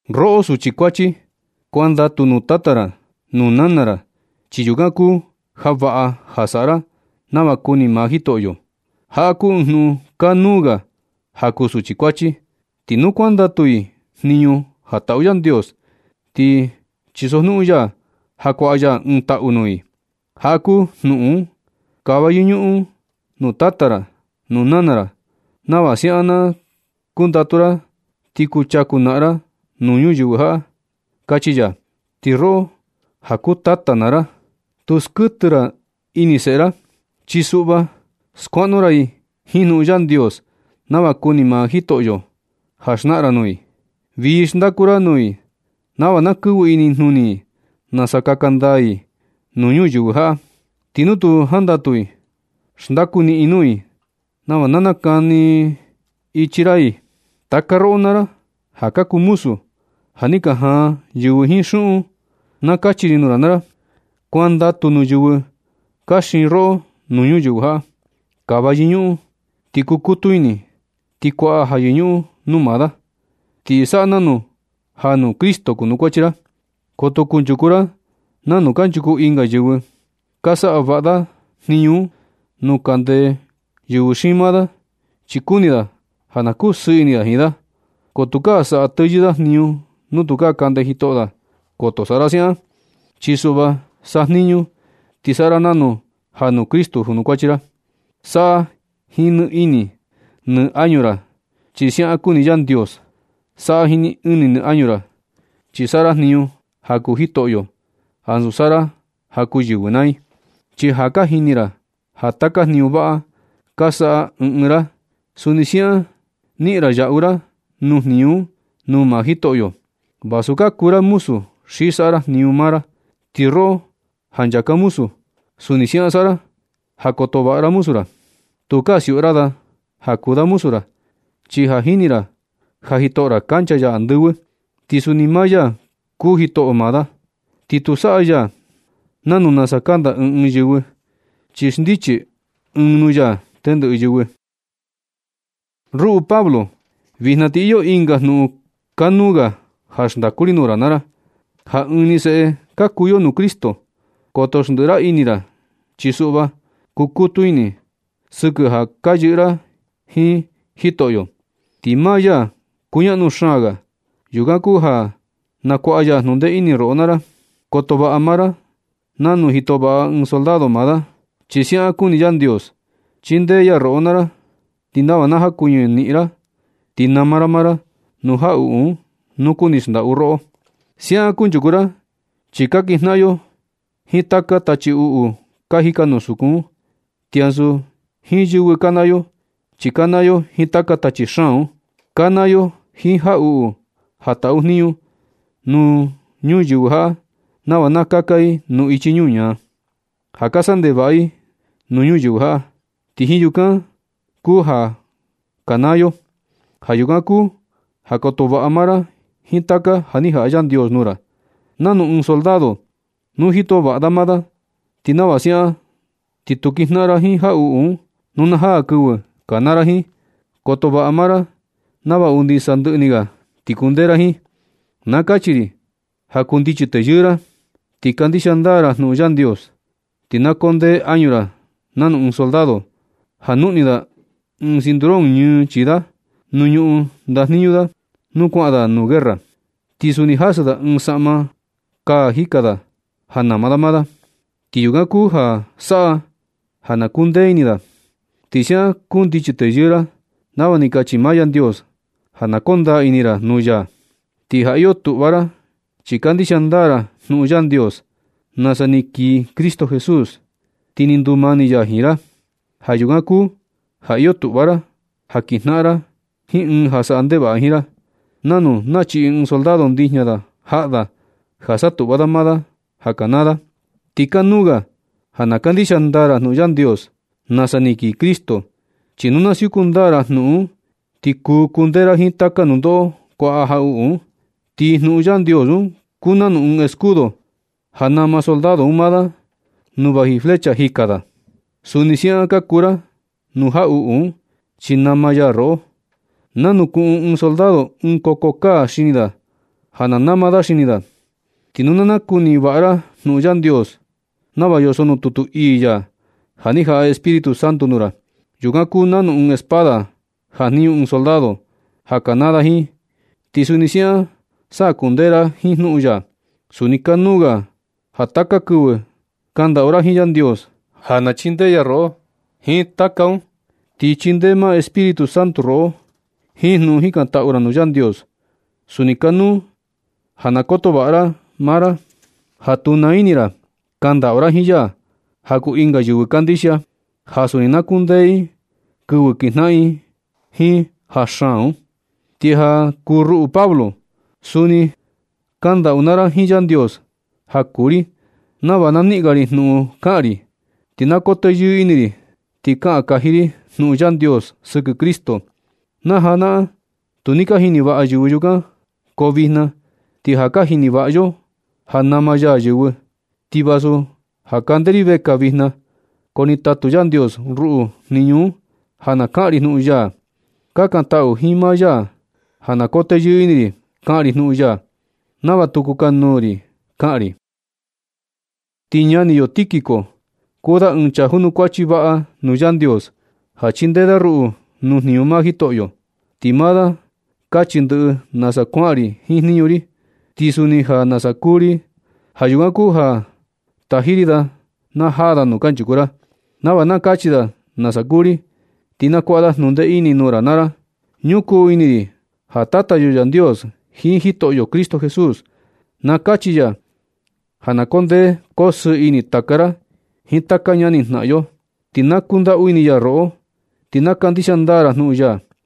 Roꞌo suchi kuachi, kuandatu nuu tata ra nuu nana ra, chi yukan kuu ja vaꞌa ja saꞌa ra nava kuni maa Jitoꞌo. Jaꞌa kuu ɨɨn jnuꞌun kanuu ga ja kuu suchi kuachi. Ti nu kuandatu i jniñu ja taꞌu Yandios, ti chisojnuꞌun ya ja kuaꞌa ya ɨɨn taꞌu nuu i. Jaꞌa kuu jnuꞌun: “Kava yɨñuꞌun nuu tata ra, nuu nana ra, nava siaꞌan na kundatu ra ti kuchaku naꞌan ra nuu ñuyɨvɨ jaꞌa”, kachi ya. Ti roꞌo ja kuu tata naa ra, tu skuɨtɨ ra ini seꞌe ra, chi suꞌva skuaꞌnu ra i jiin jnuꞌun Yandios nava kuni maa Jitoꞌo ja xnaꞌan ra nuu i. Vii xndaku ra nuu i nava na kɨvɨ inijnuni i nasa kaka ndaa i nuu ñuyɨvɨ jaꞌa. Ti nu tu jandatu i, xndaku niꞌin nuu i nava na nakani ichi ra i. Taka roꞌo naa ra ja ka kuu muzu, ja ni ka jaan yɨvɨ jiin xuꞌun, na kachi ri nuu ra naa ra, kuandatu nuu yɨvɨ ka xiin roꞌo nuu ñuyɨvɨ jaꞌa. Kava yɨñuꞌun ti kukutu ini ti kuaꞌa ja yɨñuꞌun nuu maa da. Ti saꞌa nanu ja nuu Cristo junukuachi ra. Koto kunchuku ra nanu kanchuku ɨnga yɨvɨ. Ka saꞌa vaꞌa da jniñu un nu kande yɨvɨ xiin maa da, chi kuni da ja na kusɨɨ ini da jiin da. Ko tukaa saꞌa teyɨɨ da jniñu nu tukaa kande jitoꞌo da. Koto saꞌa ra siaꞌan, chi suꞌva sajniñu ti saꞌa ra nanu ja nuu Cristo junukuachi ra. Saꞌa jiin nɨ ini nɨ añu ra, chi siaꞌan kuni Yandios. Saꞌa jiin nɨ ini nɨ añu ra, chi saꞌa ra jniñu ja kuu Jitoꞌyo ansu saꞌa ra ja kuu yɨvɨ naa i. Chi ja ka jini ra ja taka jniñu vaꞌa ka saꞌa ɨɨn ɨɨn ra, suni siaꞌan niꞌin ra yaꞌu ra nuu jniñu un nuu maa Jitoꞌyo, vasu ka kuu ra muzu xi saꞌa ra jniñu maa ra. Ti roꞌo ja ka nchaka muzu, suni siaꞌan saꞌa ra ja koto vaꞌa ra muzu ra. Tukaa siuꞌu ra da ja kuu da muzu ra, chi ja jini ra ja Jitoꞌo ra kancha ya andɨvɨ. Ti suni maa ya kuu Jitoꞌo maa da, ti tu saꞌa ya nanu nasa kanda ɨɨn ɨɨn yɨvɨ, chi xndichi ɨɨn nuu ya tendɨꞌɨ yɨvɨ. Ruꞌu Pablo, vijna ti iyo ɨnga jnuꞌun kanuu ga ja xndaku ri nuu ra naa ra, ja ɨɨn ni seꞌe ka kuu yo nuu Cristo. Koto xndiꞌi ra ini ra, chi suꞌva kukutu ini sɨkɨ ja ka yɨꞌɨ ra jiin Jitoꞌo, ti maa ya kuñaꞌnu xaan ga. Yukan kuu ja na kuaꞌa ya jnundee ini roꞌo naa ra. Koto vaꞌa maa ra nanu jito vaꞌa ɨɨn soldado maa da, chi siaꞌan kuni Yandios chindee ya roꞌo naa ra, ti nava na jakuɨñɨ niꞌin ra ti nama ra maa ra nuu jaꞌuꞌu un nu kuni xndaꞌu roꞌo. Siaꞌan kunchuku ra chi ka kinjnaꞌan yo jiin taka tachi uꞌu ka jika nuu sukun un. Ti ansu jiin yɨvɨ kanaa yo, chi kanaa yo jiin taka tachi xaan un. Kanaa yo jiin jaꞌuꞌu ja taꞌu jniñu nuu yɨvɨ jaꞌa nava na kaka i nuu ichi ñuñaa, ja ka saꞌa ndevaꞌa i nuu ñuyɨvɨ jaꞌa. Ti jiin yukan kuu ja kanaa yo. Ja yukan kuu ja koto vaꞌa maa ra jiin taka ja ni jaꞌa Yandios nuu ra, nanu ɨɨn soldado nu jito vaꞌa da maa da. Ti nava siaꞌan na ti kuu kinjnaꞌan ra jiin jaꞌuꞌu un nu na jaa kɨvɨ kanaa ra jiin. Koto vaꞌa maa ra nava undi sandɨꞌɨ ni ga ti kundee ra jiin. Na kachi ri ja kundichi teyɨɨ ra ti kandixia ndaa ra jnuꞌun Yandios. Ti na koo ndee añu ra nanu ɨɨn soldado ja juꞌni da ɨɨn cinturón ñɨɨ chii da nu ñuꞌun ndajniñu da, nu kuaꞌan da nuu guerra. Ti suni jasɨ da ɨɨn saꞌma kaa jika da ja na nama da maa da. Ti yukan kuu ja saꞌa ja na kundee ini da. Ti siaꞌan kundichi teyɨɨ ra nava ni kachi maa Yandios ja na koo ndaa ini ra nuu ya. Ti ja iyo tuꞌva ra chi kandixia ndaa ra jnuꞌun Yandios nasa ni kii Cristo Jesús, ti ni ndumani ya jiin ra. Ja yukan kuu ja iyo tuꞌva ra ja kinjnaꞌan ra jiin ɨɨn ja saꞌa ndevaꞌa jiin ra, nanu nachiꞌi ɨɨn soldado ndijña da jaꞌa da ja satuꞌva da maa da ja kanaa da. Ti kanuu ga ja na kandixia ndaa ra jnuꞌun Yandios nasa ni kii Cristo, chi nu na siuku ndaa ra jnuꞌun un ti kuu kundee ra jiin taka nundoꞌo kuaꞌa jaꞌuꞌu un. Ti jnuꞌun Yandios un kuu nanu ɨɨn escudo ja nama soldado un maa da nuu vaji flecha jika da. Suni siaꞌan kaku ra nuu jaꞌuꞌu un chi nama ya roꞌo. Nanu kuꞌun ɨɨn soldado ɨɨn koko kaa xini da ja na nama da xini da. Ti nu na nakuni vaꞌa ra jnuꞌun Yandios nava yoso nuu tutu ii ya, ja ni jaꞌa Espíritu Santo nuu ra. Yukan kuu nanu ɨɨn espada jajniñu ɨɨn soldado ja kanaa da jiin, ti suni siaꞌan sa kundee ra jiin jnuꞌun ya. Suni kanuu ga ja taka kɨvɨ kandaꞌu ra jiin Yandios ja na chindee ya roꞌo jiin taka un. Ti chindee maa Espíritu Santo roꞌo jiin jnuꞌun jikantaꞌu ra nuu Yandios. Suni kanuu ja na koto vaꞌa ra maa ra ja tu naa ini ra kandaꞌu ra jiin ya ja kuu ɨnga yɨvɨ kandixia, ja suni na kundee i kɨvɨ kinjnaꞌan i jiin ja xaan un. Ti ja kuu ruꞌu Pablo, suni kandaꞌu naa ra jiin Yandios ja kuu ri nava na niꞌin ga ri jnuꞌun kaꞌan ri, ti na koo teyɨɨ ini ri ti kaꞌan kaji ri jnuꞌun Yandios sɨkɨ Cristo. Najanaꞌan tu ni ka jini vaꞌa yɨvɨ yukan, ko vijna ti ja ka jini vaꞌa yo ja nama ya yɨvɨ. Ti vasu ja kande ri vekaa vijna, ko ni tatu Yandios ruꞌu jniñu un ja na kaꞌan ri jnuꞌun ya. Kakantaꞌu jiin maa ya ja na koo teyɨɨ ini ri kaꞌan ri jnuꞌun ya, nava tu kukanuu ri kaꞌan ri. Ti ñani yo Tíquico, kuu da ɨɨn chaa junukuachi vaꞌa nuu Yandios ja chindee da ruꞌu nuu jniñu maa Jitoꞌo. Ti maa da kachi ndɨꞌɨ nasa kuaꞌan ri jiin jniñu ri, ti suni ja nasa kuu ri. Ja yukan kuu ja taji ri da na jaa da nuu kanchuku ra, nava na kachi da nasa kuu ri. Ti na kuaꞌa da jnundee ini nuu ra naa ra. Ñukuu ini ri ja Tata yo Yandios jiin Jitoꞌo Cristo Jesús na kachi ya ja na koo ndee koo sɨɨ ini taka ra jiin taka ñani jnaꞌan yo. Ti na kundaꞌu ini ya roꞌo, ti na kandixia ndaa ra jnuꞌun ya.